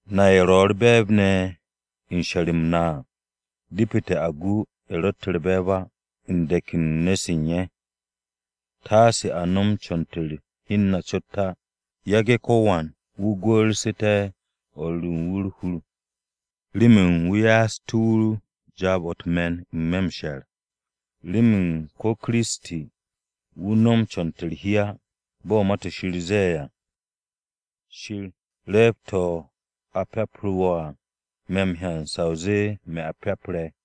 Na ye̱ ro̱ u̱r-be̱e̱b ne̱ u̱n she̱r-m na à, depete̱ a gu ye̱ ro̱tte̱ u̱r-be̱e̱b á u̱n de̱k u̱n nu̱-se u̱n ye̱. Taase a no̱m co̱n-to̱ u̱n hi u̱n na cot á. Yage̱ ko̱wan wu̱ gwu̱'u̱ste̱ o̱r ru u̱n wu̱ u̱r-hur remen wu̱ ye'et wu̱ jaab-o̱ u̱t-me̱n n-me̱ m-she̱r. Remen ko̱ Kiristi, wu̱ no̱m co̱n-to̱ u̱r-hi á. Bo̱ Ma-to̱ Shir ze̱e̱ à, “Shir, re̱e̱b-to̱ a pyapu̱ru̱ wo̱ à, me̱ m-hyan sa o zee me̱ a pyapre̱.”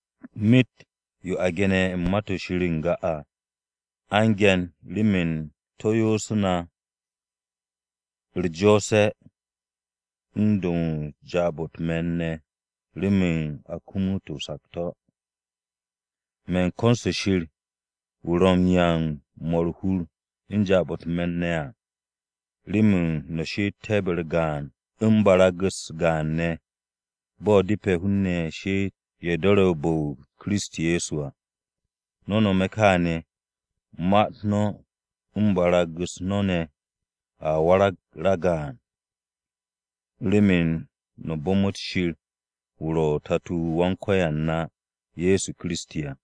Myet yo a ge̱ne̱ u̱n Ma-to̱ Shir n-ga à, a u̱n ge̱n remen to̱ yoosú̱ na u̱r-jo̱o̱se̱ u̱n do̱ u̱n jaab-o̱ u̱t-me̱n ne̱ remen a kumut o-sakto̱. Me̱n ko̱n-se Shir wu̱ ro̱ m-'ya u̱n 'mo̱ u̱r-hur u̱n jaab-o̱ u̱t-me̱n ne̱ à, remen no̱ she'etté̱ be-u̱r gaan u̱n barag-u̱s gaan ne̱, bo̱ depe̱ hun-ne̱ she'et ye̱ do̱re̱ bu̱-o Kiristi Ye̱so à. No̱ nome̱ kaane̱, ma-u̱t no̱ u̱n barag-u̱s no̱ ne̱ a warag ragaan remen no̱ bu̱mu̱t Shir wu̱ ro̱ Tato-o Wan-Ko̱yan na, Ye̱so Kiristi à.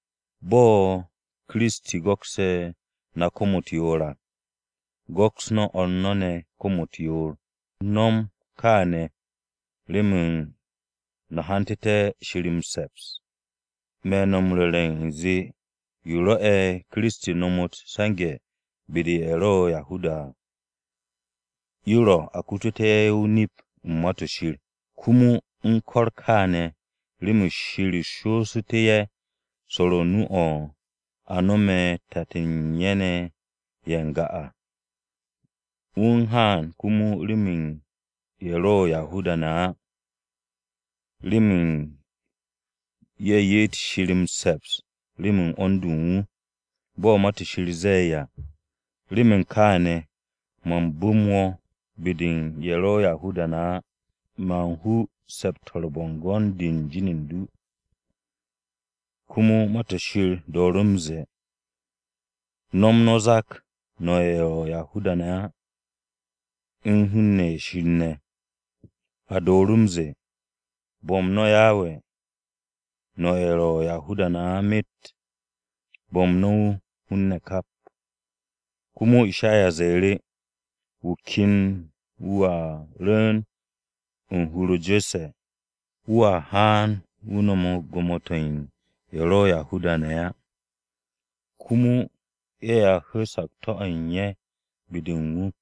Bo̱ Kiristi go̱ksu̱ no̱ kom-u̱t yoor à, go̱ks no̱ o̱r no̱ ne̱ kom-u̱t yoor. No̱m no̱ kaane̱ remen no̱ hantu̱té̱ Shir m-se̱ps. Me̱ no̱ m-ru̱re̱ u̱nze yo rwo̱'e̱ Kiristi nomot m-se̱nge̱ be-de u̱n Yahuda-ne̱ à, yo ro̱ a kututú̱ ye̱ nip-o̱ u̱n Ma-to̱ Shir. Komo, u̱n ko̱r kaane̱, remen Shir shoosu̱tú̱ ye̱ swo̱o̱ru̱ nu-o̱ a no̱me̱ tat-ne̱ ye̱ u̱n ye̱ n-ga à. Wu̱ u̱n haan komo remen ye̱ ro̱ Yahuda-ne̱ á, remen ye̱ ye'et Shir m-se̱ps remen 'wo̱n-de u̱n wu̱. Bo̱ Ma-to̱ Shir ze̱e̱ à: “Remen kaane̱, man bu̱m wo̱ be-de u̱n ye̱ ro̱ Yahuda-ne̱ á. Man hu se̱p-to̱ u̱n bo̱ngo̱n-de u̱n jin u̱n du.” Komo Ma-to̱ Shir dooru̱ m-ze̱e̱: “No̱m no̱ o-zak, no̱ ye̱ ro̱ Yahuda-ne̱ á, u̱n hun-ne̱ ye̱ Shir ne̱.” A dooru̱ m-ze̱e̱: “Bo̱m no̱ Yawe no̱ ye̱ ro̱ Yahuda-ne̱ á myet, bo̱m no̱ wu̱ hun-ne̱ kap.” Komo Ishaya ze̱e̱ru̱: “Wu̱ ken wu̱ a rwu̱u̱n u̱n hur-o Je̱sse̱, wu̱a haan wu̱ no̱m gwo̱mo-to̱ u̱n ye̱ ro̱ Yahuda-ne̱ á. Komo ye̱a hu̱u̱ sakto̱-o̱ u̱n ye̱ be-de u̱n wu̱.”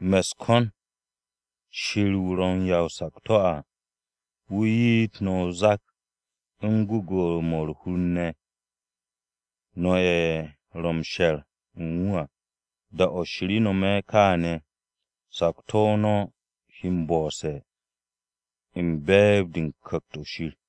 Me̱ u̱s-ko̱n, Shir wu̱ ro̱ 'ya o-sakto̱ à, wu̱ ye'et no̱ o-zak u̱n gwu̱gwu̱-mo̱ u̱r-hur ne̱, no̱ ye̱ ro̱ m-she̱r u̱n wu̱ à. Da-o̱ Shir no̱me̱ kaane̱, sakto̱-o no̱ he m-bo̱'o̱se̱ u̱n be̱e̱b-de u̱n Ku̱kt-o̱ Shir.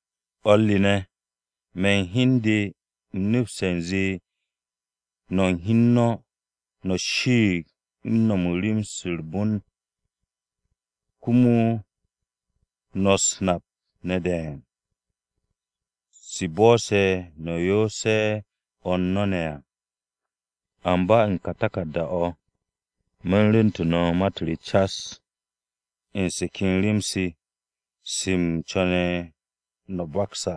O̱r re ne̱, me̱ u̱n hi u̱n de u̱m nepste̱ u̱nze no̱ u̱n hi u̱n no̱, no̱ shiig u̱n no̱m u̱n rem-se u̱r-bon, komo no̱ u̱s-nap ne̱ de̱e̱n, se̱ bo̱'o̱se̱ no̱ yoose̱ o̱r no̱ ne̱ à. Amba u̱n ka taku̱rda-o̱ me̱ u̱n rwu̱ntu̱ no̱ ma-u̱t re cas. U̱n se ken rem-se, se u̱m co̱ne̱ no̱ m-bakse̱ à.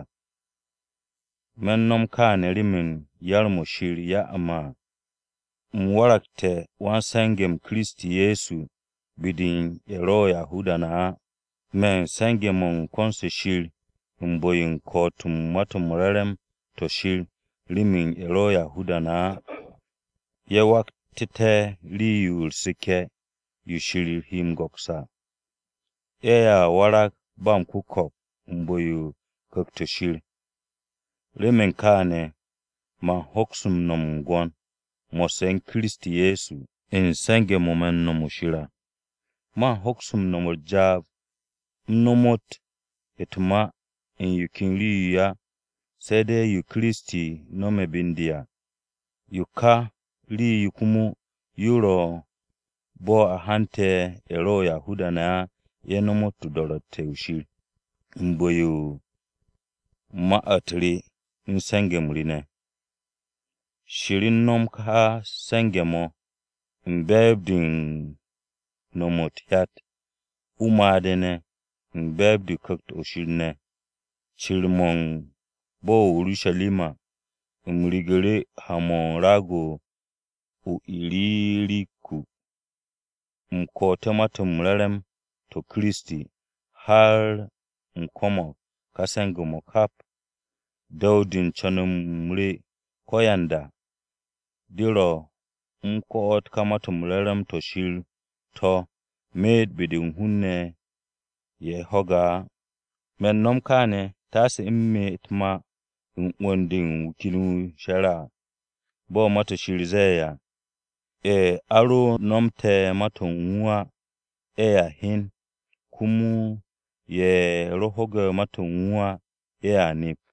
Me̱ u̱n no̱m kaane̱ remen yar-mo̱ Shir ya'u̱ me̱ à. U̱m waragte̱ wan-se̱nge̱-m Kiristi Ye̱so be-de u̱n ye̱ ro̱ Yahuda-ne̱ á. Me̱ u̱n se̱nge̱-mo̱ u̱n ko̱n-se Shir u̱n bu̱-yo m-ko̱'o̱t u̱n Ma-to̱ m-Re̱re̱m to̱ Shir remen ye̱ ro̱ Yahuda-ne̱ á, ye̱ waragté̱ rii-yo u̱r-seke̱ yo Shir he m-go̱ks à. Ye̱a warag ba m-ku̱ko̱p u̱n bu̱-yo u̱n Ku̱kt-o̱ Shir. Remen kaane̱, man hoks no̱m m-gwo̱n mo̱sse̱ u̱n Kiristi Ye̱so ne̱ u̱n se̱nge̱-mo̱ me̱ u̱n no̱me̱ u̱n Shir à. Man hoks no̱m u̱n jaab u̱m nomot u̱t-ma u̱n yo ken rii-yo á, se̱ de̱ yo Kiristi no̱me̱ be u̱n de à. Yo ka rii-yo komo yo ro̱ bo̱ a hante̱ ye̱ ro̱ Yahuda-ne̱ á ye̱ nomot do̱ru̱tte̱-o̱ Shir, u̱n bu̱-yo u̱n ma-u̱t re u̱n se̱nge̱-m re ne̱. Shir u̱n no̱m ka se̱nge̱-mo̱, u̱n be̱e̱b-de u̱n no̱m u̱t-hyat, o-made̱ ne̱, u̱n be̱e̱b-de u̱n Ku̱kt-o̱ Shir ne̱. Cir-mo̱ u̱n bo̱-o̱ o-Urusharima u̱m rigu̱ru̱ ha-mo̱ u̱n raag-o̱ o-Iririkum, u̱m ko̱'o̱te̱ Ma-to̱ m-Re̱re̱m to̱ mo̱ u̱n Kiristi, har u̱m ko̱mo̱g ka se̱nge̱-mo̱ kap. Du̱w-de u̱n co̱n-m re ko̱yanda, mo̱ ro̱, u̱m ko̱'o̱t ka Ma-to̱ m-Re̱re̱m to̱ Shir to̱ myet be-de hun-ne̱ ye̱ ho̱ge̱ ma-u̱t Kiristi á. Me̱ u̱n no̱m kaane̱, taase u̱m me u̱t-ma u̱n 'wu̱n-de wu̱ ken wu̱ she̱re̱ à. Bo̱ Ma-to̱ Shir ze̱e̱ à: “Ye̱ a ro nomote̱ ma-to̱ u̱n wu̱ á, ye̱a hyen. Komo ye̱ ro ho̱gu̱te̱ ma-to̱ u̱n wu̱ á, ye̱a nep.”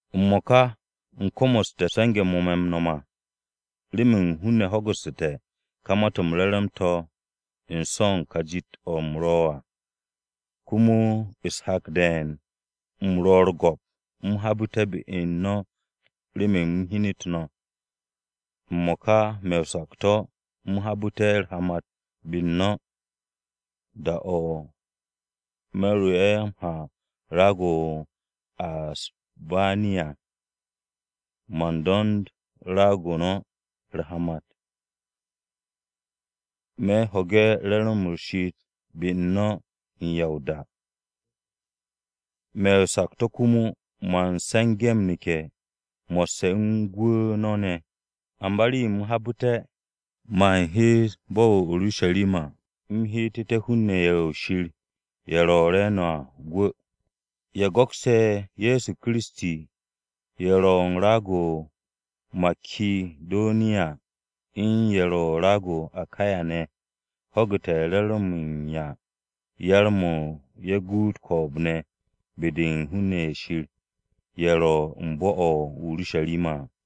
M-mo̱ka u̱m komoste̱ se̱nge̱-mo̱ me̱ m-no̱m à remen hun-ne̱ ho̱gu̱ssu̱te̱ ka Ma-to̱ m-Re̱re̱m to̱ u̱n so̱ u̱n ka jit-o̱ u̱m ro̱ à. Komo u̱s-hak de̱e̱n u̱m ro̱ u̱r-go̱p u̱m habu̱te̱ be-u̱r no̱ remen u̱m hyenet no̱. M-mo̱ka me̱ o-sakto̱, u̱m habu̱te̱ u̱r-hamat be-u̱r no̱. Da-o̱ me̱ ro m-ha raag-o̱ o-Asbaniya, man do̱nd raag-o no̱ u̱r-hamat. Me̱ ho̱ge̱ re̱re̱m-mo̱ u̱r-she'et be-u̱r no̱ u̱n ya o-da. Me̱ o-sakto̱ komo, man se̱nge̱ m-neke̱ mo̱sse̱ u̱n gwu̱ no̱ ne̱. Amba rii-yo u̱m habu̱te̱, man hees bo̱-o̱ o-Urusharima u̱m heetu̱te̱ hun-ne̱ ye̱ Shir ye̱ ro̱ re̱e̱no̱ à gwu̱. Ye̱ go̱kse̱ Ye̱so Kiristi ye̱ ro̱ u̱n raag-o̱ o-Makidoniya u̱n ye̱ ro̱ u̱n raag-o̱ o-Akaya ne̱ à, ho̱gu̱te̱ re̱re̱m-mo̱ u̱n 'ya m-yar ye̱ guut ko̱o̱b-ne̱ be-de u̱n hun-ne̱ ye̱ Shir ye̱ ro̱ u̱n bo̱-o̱ o-Urusharima à.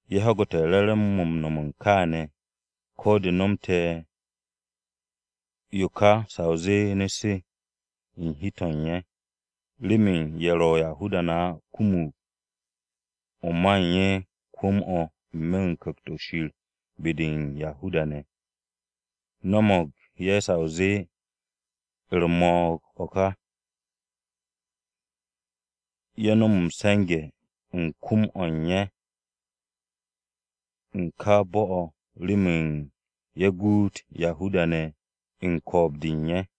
Ye̱ ho̱gu̱te̱ re̱re̱m-mo̱ m-no̱m u̱n kaane̱, ko̱ de nomte̱ yo ka sa o zee nu̱-se, u̱n hi-to̱ u̱n ye̱. Remen ye̱ ro̱ Yahuda-ne̱ á kumug o̱ ma u̱n ye̱ kwu̱m-o̱ n-me̱ u̱n Ku̱kt-o̱ Shir be-de u̱n Yahuda-ne̱, no̱mo̱g ye̱ sa o zee u̱r-mo̱o̱g o̱ ka, ye̱ nom m-se̱nge̱ u̱n kwu̱m-o̱ u̱n ye̱ u̱n ka bo̱-o̱ remen ye̱ guut Yahuda-ne̱ u̱n ko̱o̱b-de u̱n ye̱.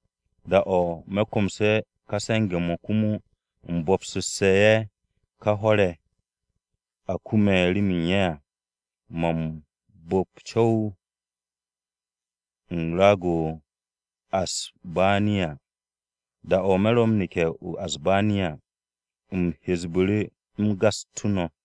Da-o̱ me̱ komse̱ ka se̱nge̱-mo̱, komo u̱m bo̱bsu̱sse̱ ye̱ ka hwo̱r-ye̱ a kume̱ remen ye̱ à, man bu̱p co̱w-yo u̱n raag-o̱ o-Asbaniya. Da-o̱ me̱ ro m-neke̱ o-Asbaniya, u̱m hesbu̱ru̱, u̱m gastú̱ no̱.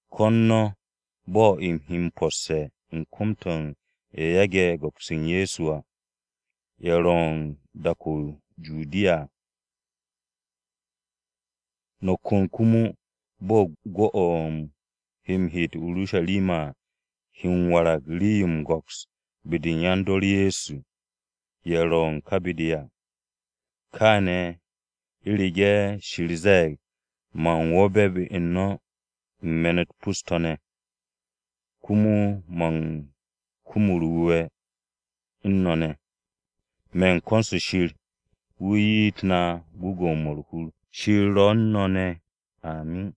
Ko̱n no̱ bo̱ u̱m he m-posse̱ u̱n kom-to̱ u̱n ye̱ yage̱ go̱ks u̱n Ye̱so à, ye̱ ro̱ u̱n dak-o̱ o-Judiya. No̱ kon komo bo̱ gwu̱-o̱ u̱m he m-heet o-Urusharima à, he m-warag rii-yo m-go̱ks be-de u̱n yan-dor Ye̱so, ye̱ ro̱ u̱n ka be-de à. Kaane̱ u̱rege̱ Shir ze̱e̱g, man wo̱be̱ be-u̱r no̱ u̱n me̱n-u̱t pus-to̱, komo man kum u̱r-wu̱we̱ u̱n no̱ ne̱. Me̱ u̱n ko̱n-se Shir, wu̱ ye'et na gwu̱gwu̱-mo̱ u̱r-hur. Shir ro̱ u̱n no̱ ne̱! Amin.